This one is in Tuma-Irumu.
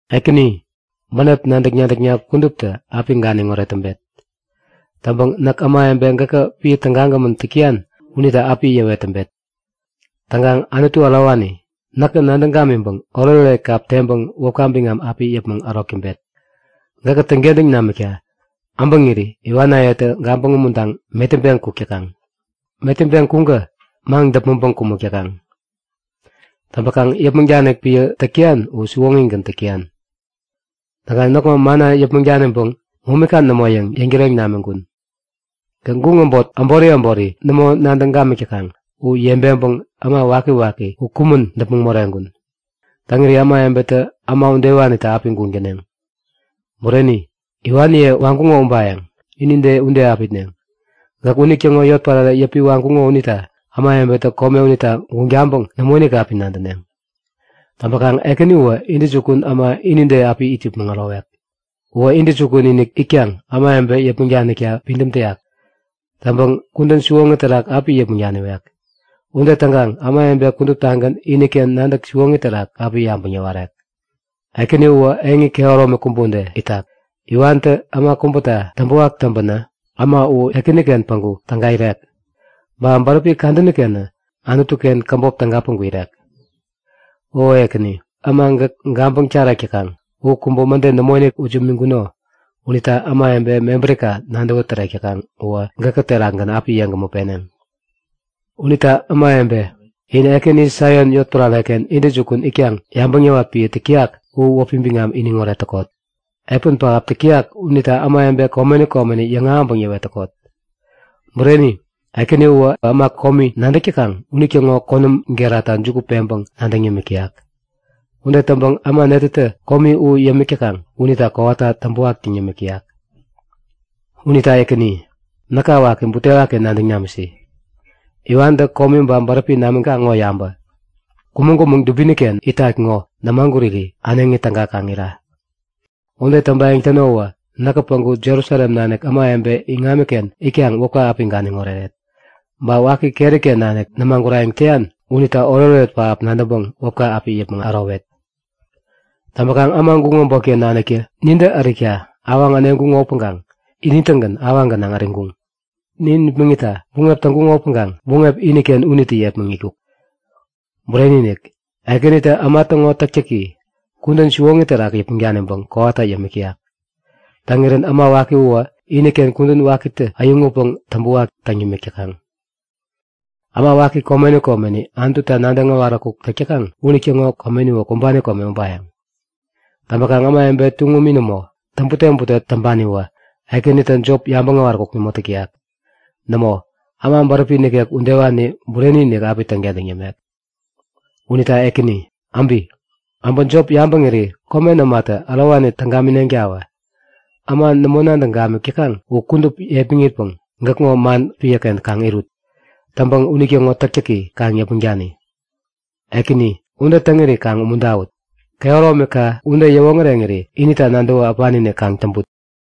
Ekäni, bänep nadäk-nadäkna kuduptä api ganiŋoret täŋpet. Täŋpäŋ näk ämawebe gäkä piä tägagämän täk täyan unita api yäwet täŋpet. Täŋkaŋ Anutu ärowani, näkä nadäŋ gamiŋpäŋ oretoret kap teŋpäŋ wäpka biŋam api yäpmäŋ ärok täŋpet. Gäkä täŋkentäŋ namikta äbäŋiri iwanayetä gabäŋ umuntaŋ metäŋpeŋ kuk täkaŋ. Metäŋpeŋ kuŋkä maŋ-däpmäŋpäŋ kumäk täkaŋ. Täŋpäkaŋ yäpmäŋ danik piä täk täyan uwä siwoŋigän täk täyan. Täŋkaŋ näkŋo manna yäpmäŋ daniŋpäŋ momika nämo yäŋ yäŋtäreŋ namiŋkun. Gäk guŋ äbot äbori äbori nämo nadäŋ gamik täkaŋ u yebeŋpäŋ äma wakiwaki u kumän däpmäŋ moreŋkun. Täŋiri ämawebetä äma udewanita api guŋ täneŋ. Bureni, iwaniye waŋkuŋo ubayäŋ. Inide ude api itneŋ. Gäk unitäŋo yotpärare yäpi waŋkuŋo unita ämawebetä kome unita täŋguŋ taŋpäŋ nämoinik api nadäneŋ. Täŋpäkaŋ Ekäni uwä intäjukun äma inide api it yäpmäŋ ärowek. Uwä intäjukun-inik itkaŋ ämawebe yäpmäŋ danikta pidäm täyak. Täŋpäŋ kudän siwoŋi terak api yäpmäŋ daniwek. Ude täŋkaŋ ämawebe kuduptagän iniken nadäk siwoŋi terak api yabäŋ yäwarek. Ekäni uwä eŋi kehäromi kubä ude itak. Iwantä äma kubäta täŋpäwak täŋpänä, äma u Ekäniken päŋku täga irek. Ba bäräpi kadänikenä Anutuken käbop täga päŋku irek. O Ekäni, äma gäk gabäŋ tarek täkaŋ u kubä mäde nämoinik ut imiŋkuno unita ämawebe mebärika nadäwä tärek täkaŋ uwä gäkä terakgän api yeŋgämä peneŋ. Unita ämawebe, in Ekäni, Saion yotpärareken intäjukun itkaŋ yabäŋ yäwat piä täk täyak u wäpi biŋami iniŋoret täkot! Epän pähap täk täyak unita ämawebe komeni komeni yäŋahäŋpäŋ yäwet täkot. Bureni, Ekäni uwä äma komi nadäk täkaŋ unitäŋo konäm gerata juku peŋpäŋ nadäŋ yämik täyak. Ude täŋpäŋ äma netätä komi u yämik täkaŋ unita kowata täŋpäwak täŋ yämik täyak. Unita Ekäni, näka waki, butewaki nadäŋ namisi. Iwantä komi ba bäräpi namikaŋ ŋo yabä! Kumäŋ-kumäŋ dubiniken itat ŋo nämaguri äneŋi täga kaŋ ira! Ude täŋpayäŋ täno uwä näk päŋku Jerusalem nanik ämawebe iŋamiken itkaŋ wäpka api ganiŋ oreret! Ba waki keriken nanik nämagurayäŋ täyan unita oretoret pähap nadäŋpäŋ wäpka api yäpmäŋ ärowet. Täŋpäkaŋ äma guŋ äbotken naniktä nintä ärikta awaŋ äneŋkuŋo upäŋkaŋ ini-tägän awaŋi gänaŋ äriŋkuŋ. Nin nipmäŋitta buŋep täŋkuŋo upäŋkaŋ buŋep iniken unitä yepmäŋitkuk. Bureni-inik, Ekänitä äma täŋo täktäki, kudän siwoŋi terak yäpmäŋ daniŋpäŋ kowata yämik täyak. Täŋirän äma waki uwä iniken kudän wakitä äyäŋutpäŋ täŋpäwak täŋ yämik täkaŋ. Äma waki komeni komeni Anututa nadäŋ äwaräkuk täk täkaŋ unitäŋo komeniwä kumbani kome ubayäŋ. Täŋpäkaŋ ämawebe tuŋumi nämo, täŋbute-bute täŋpaniwä Ekänitä jop yabäŋ äwaräkuk nämo täk täyak. Nämo, äma bäräpi nikek udewani bureni-inik api täŋkentäŋ yämek. Unita Ekäni, äbi! Äbä jop yabäŋiri komen ämatä ärowani täŋ gamineŋtawä! Äma nämo nadäŋ gamik täkaŋ u kudup yepmaŋpikaŋ gäkŋo man piäken kaŋ irut. Täŋpäŋ unitäŋo täktäki kaŋ yäpmäŋ dani. Ekäni, ude täŋiri kaŋ umuntäwut. Kehäromika ude yäwoŋäreŋiri inita nadäwä äpani-inik kaŋ täŋput.